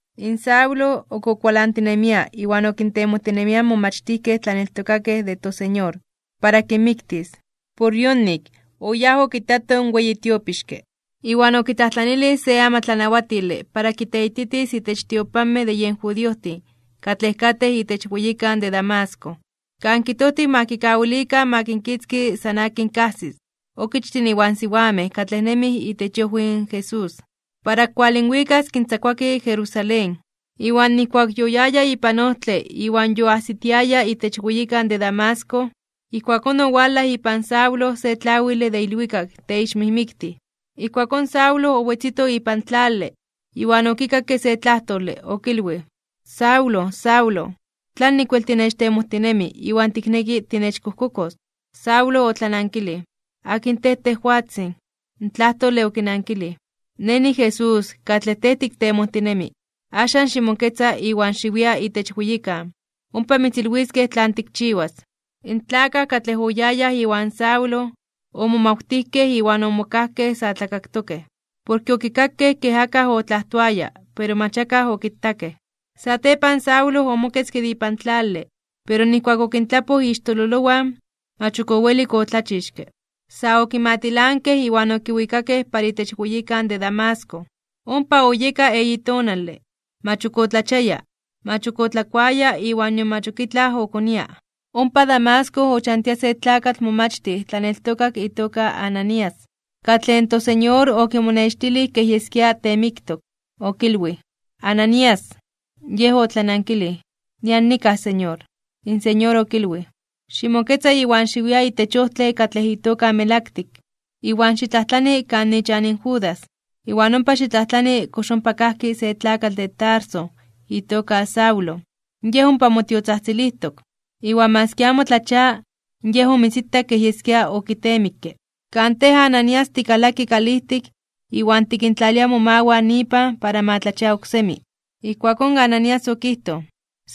In Saulo, ok okualantinemia iwan okintemojtinemia in momachtijkej tlaneltokakej de toSeñor, para kinmiktis. Por yonik, oyáj okitato in weyi tiopixke, iwan okitlajtlanilij se amatlanawatile para kiteititis itech tiopanmej de yen judiojtin katlej katej itech weyikan de Damasco, kan kijtojtiw ma kikawilikan ma kinkitzki san akin kajsis, okichtin iwan siwamej katlej nemij itech iojwi in Jesús, para kinwalinwikas kintzakuaki Jerusalén. Iwan nijkuak yoyaya ipan ojtle iwan yoajsitiaya itech weyikan de Damasco, ijkuakón owalaj ipan Saulo se tlawile de ilwikak teixmijmiktij. Ijkuakón Saulo owetzito ipan tlale, iwan okikakke se tlajtole, okilwij: ―Saulo, Saulo, ¿tlanik wel tinechtemojtinemi iwan tikneki tinechkojkokos? Saulo otlanankilij: ―¿Akin tej, tejwatzin? In tlajtole okinankilij: ―Nej niJesús, katlej tej tiktemojtinemi. Axan, ximoketza iwan xiwia itech weyikan, ompa mitzilwiskej tlan tikchiwas. In tlakaj katlej oyayaj iwan Saulo, omomawtijkej iwan omokajkej sa tlakaktokej, porke okikakej ke akaj otlajtoaya pero mach akaj okitakej. Satepan Saulo omoketzke de ipan tlale, pero nijkuak okintlapoj ixtololowan, mach ok owelik otlachixke. Sa okimatilankej iwan okiwikakej para itech weyikan de Damasco. Ompa oyeka eyi tonale, mach ok otlachiaya, mach ok otlakuaya iwan nion mach ok itlaj okonia. Ompa Damasco ochantia se tlakatl momachtij tlaneltokak itoka Ananías, katlej in toSeñor okimonextilij kej yeskia teemiktok. Okilwij: ―¡Ananías! Yej otlanankilij: ―Nian nikaj, Señor. In Señor okilwij: ―Ximoketza iwan xiwia itech ojtle katlej itoka Melaktik, iwan xitlajtlani kan ichan Judas, iwan ompa xitlajtlani kox ompa kajki se tlakatl de Tarso itoka Saulo, yej ompa motiotzajtzilijtok. Iwan maski amo tlachia, yej omitzitak kej yeskia okitemikke, kan tej Ananías tikalaki kalijtik iwan tikintlalia momawan ipan para ma tlachia oksemi. Ijkuakón Ananías okijtoj: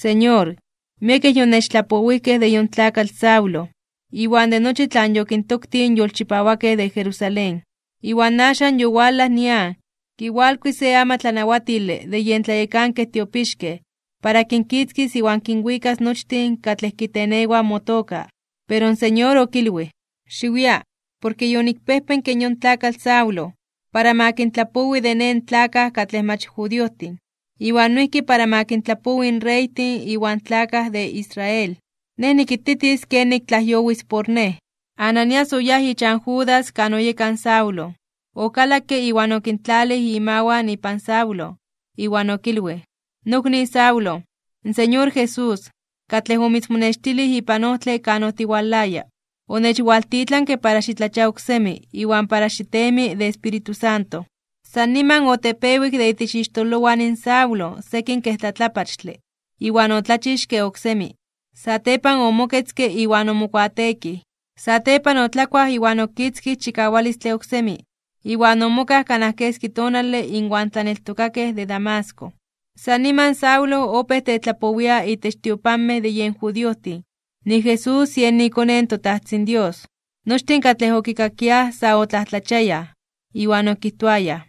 ―Señor, miekej yonechtlapowijkej de yon tlakatl Saulo, iwan de nochi tlan yokintoktij in yolchipawakej de Jerusalén. Iwan axan yowalaj nian, kiwalkui se amatlanawatile de yen tlayekankej tiopixkej para kinkitzkis iwan kinwikas nochtin katlej kitenewaj motoka. Pero in Señor okilwij: ―Xiwia, porke yonikpejpenke yon tlakatl Saulo, para ma kintlapowi de Nej in tlakaj katlej mach judiojtin, iwan noijki para ma kintlapowi in reytin iwan tlakaj de Israel. Nej nikititis kenik tlajyowis por Nej. Ananías oyáj ichan Judas kan oyeka in Saulo. Okalakke iwan okintlalij imawan ipan Saulo, iwan okilwij: ―Nokni Saulo, in Señor Jesús, katlej omitzmonextilij ipan ojtle kan otiwalaya, onechwaltitlanke para xitlachia oksemi iwan para xitemi de Espíritu Santo. San niman otepewik de itech ixtololowan in Saulo sekin kej tlatlapachtle (kakapachtli), iwan otlachixke oksemi. Satepan omoketzke iwan omokuateekij. Satepan otlakuaj iwan okitzkij chikawalistle oksemi, iwan omokaj kanaj keski tonale inwan tlaneltokakej de Damasco. San niman Saulo opéj tetlapowia itech tiopanmej de yen judiojtin nik Jesús yen iKone in toTajtzin Dios. Nochtin katlej okikakiaj sa otlajtlachiayaj (omomajmawtiayaj), iwan okijtoayaj: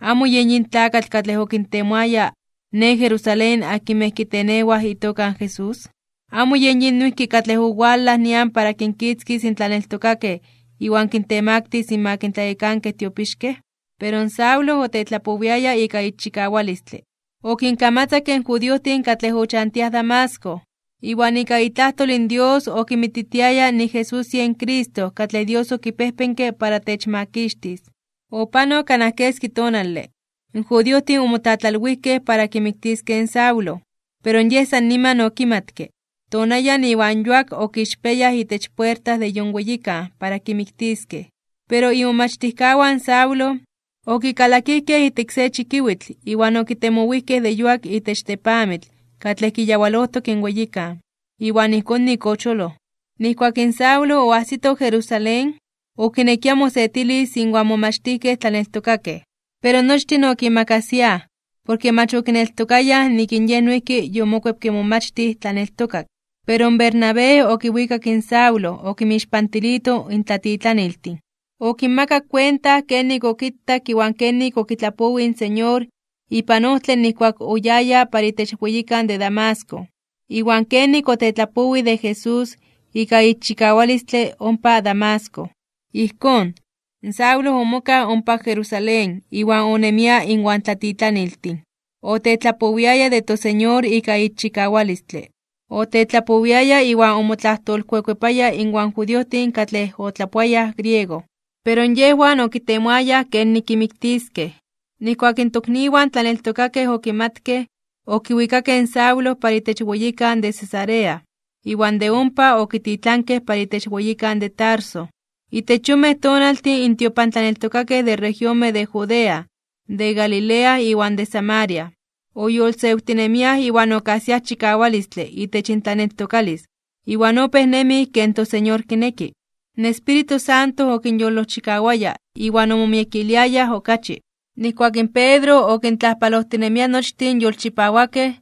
―¿Amo yen yin tlakatl katlej okintemoaya ne Jerusalén akinmej kitenewaj itoka in Jesús? ¿Amo yen yin noijki katlej owalaj nian para kinkitzkis in tlaneltokakej iwan kintemaktis (kintemaktilis) inmak in tlayekankej tiopixkej? Pero in Saulo otlajtoaya ika ixchikawalistle. Okinkamatzakke in judiojtin katlej ochantiaj Damasco. Iwan ika itlajtol in Dios okinmititiaya nik in Jesús yen Cristo katlej Dios okipejpenke para techmakixtis. Opanok kanaj keski tonale, in judiojtin omotlatlalwijkej para kimiktiskej in Saulo, pero yej san niman okimatke. Tonayan iwan yuak okixpiayaj itech puerta de yon weyikan para kimiktiskej. Pero imomachtijkawan in Saulo, okikalakijkej ijtik se chikiwitl iwan okitemowijkej de yuak itech tepamitl katlej kiyawalojtok in weyikan. Iwan ijkón nik ocholoj. Nijkuak in Saulo oajsito Jerusalén, okinekia mosetilis inwan in momachtijkej tlaneltokakej. Pero nochtin okimakasiaj, porke mach okineltokayaj nik in yej noijki yomokuepke momachtij tlaneltokak. Pero in Bernabé okiwikak in Saulo okinmixpantilito in tlatitlaniltin. Okinmakak kuenta kenik okitak iwan kenik okitlapowij in Señor ipan ojtle nijkuak oyaya para itech weyikan de Damasco, iwan kenik otetlapowij de Jesús ika ixchikawalistle ompa Damasco. Ijkón, Saulo omokaj ompa Jerusalén iwan onemia inwan tlatitlaniltin. Otetlapowiaya de toSeñor ika ixchikawalistle. Otetlapowiaya iwan omotlajtolkuekuepaya inwan judiojtin katlej otlapoayaj griego. Pero yejwan okitemoaya kenik kimiktiskej. Nijkuak in tokniwan tlaneltokakej okimatkej, okiwikakej in Saulo para itech weyikan de Cesarea, iwan de ompa okititlankej para itech weyikan de Tarso. Itech yonmej tonaltin in tiopantlaneltokakej de regionmej de Judea, de Galilea iwan de Samaria, oyolosewtinemiaj iwan okajsiaj chikawalistle itech intlaneltokalis iwan opéj nemij ken toSeñor kineki. In Espíritu Santo okinyolojchikawaya iwan omomiekiliayaj okachi. Nijkuak in Pedro okintlajpalojtinemia nochtin in yolchipawakej,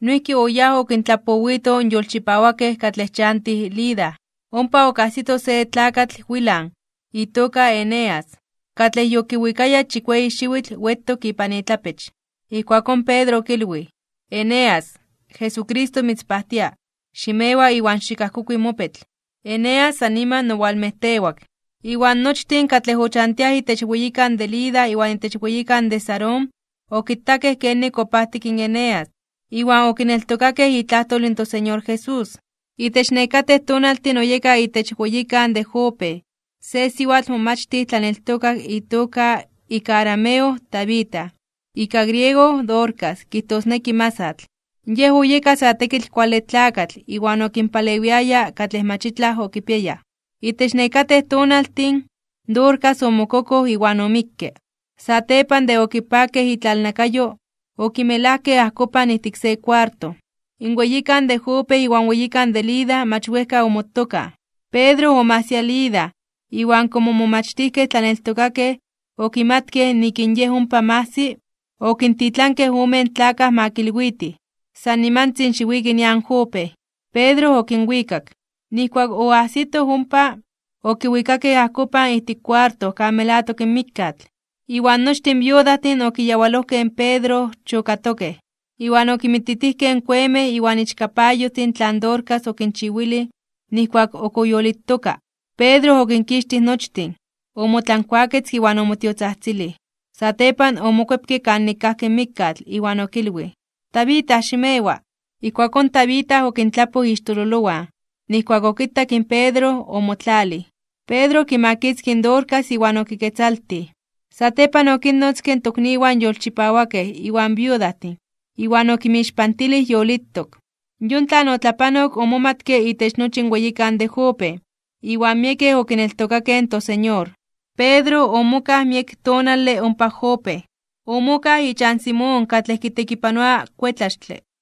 noijki oyáj okintlapowito in yolchipawakej katlej ochantiaj Lida. Ompa okajsito se tlakatl wilan (temetlatzin) itoka Eneas, katlej yokiwikaya chikueyi xiwitl wetok ipan itlapech. Ijkuakón Pedro okilwij: ―Eneas, Jesucristo mitzpajtia, ximewa iwan xikajkokui mopetl. Eneas san niman owalmejtewak. Iwan nochtin katlej ochantiaj itech weyikan de Lida iwan itech weyikan de Sarón okitakej kenik opajtik in Eneas iwan okineltokakej itlajtol in toSeñor Jesús. Itech nekatej tonaltin oyeka itech weyikan de Jope, se siwatl momachtij tlaneltokak itoka ika arameo Tabita, ika griego Dorcas kijtosneki masatl. Yej oyeka sa tekitl kuale tlakatl iwan okinpalewiaya katlej mach itlaj okipiayaj. Itech nekatej tonaltin, Dorcas omokokoj iwan omikke. Satepan de okipakej itlalnakayo, okimelajkej ajkopan ijtik se kuarto. In weyikan de Jope iwan weyikan de Lida mach wejka omotokaj, Pedro omajsia Lida iwan komo in momachtijkej tlaneltokakej okimatkej nik in yej ompa majsi, okintitlankej omen tlakaj ma kilwitij: ―San nimantzin xiwiki nian Jope. Pedro okinwikak. Nijkuak oajsito ompa, okiwikakej ajkopan ijtik kuarto kan melatok in mikkatl, iwan nochtin in viudajtin okiyawalojkej in Pedro chokatokej, iwan okinmititijkej in kuemej iwan ichkapayojtin tlan Dorcas okinchiwilij nijkuak ok oyolitoka. Pedro okinkixtij nochtin. Omotlankuaketzke iwan omotiotzajtzilij. Satepan omokuepke para kanik kajki in mikkatl, iwan okilwij: ―¡Tabita, ximewa! Ijkuakón Tabita okintlapoj ixtololowan. Nijkuak okitak in Pedro, omotlalij. Pedro okimakitzkij in Dorcas iwan okiketzaltij. Satepan okinnotzke in tokniwan yolchipawakej iwan viudajtin, iwan okinmixpantilij yolitok. Yon tlan otlapanok omomatke itech nochi in weyikan de Jope, iwan miekej okineltokakej in toSeñor. Pedro omokaj miek tonale ompa Jope. Omokaj ichan Simón katlej kitekipanoa kuetlaxtle.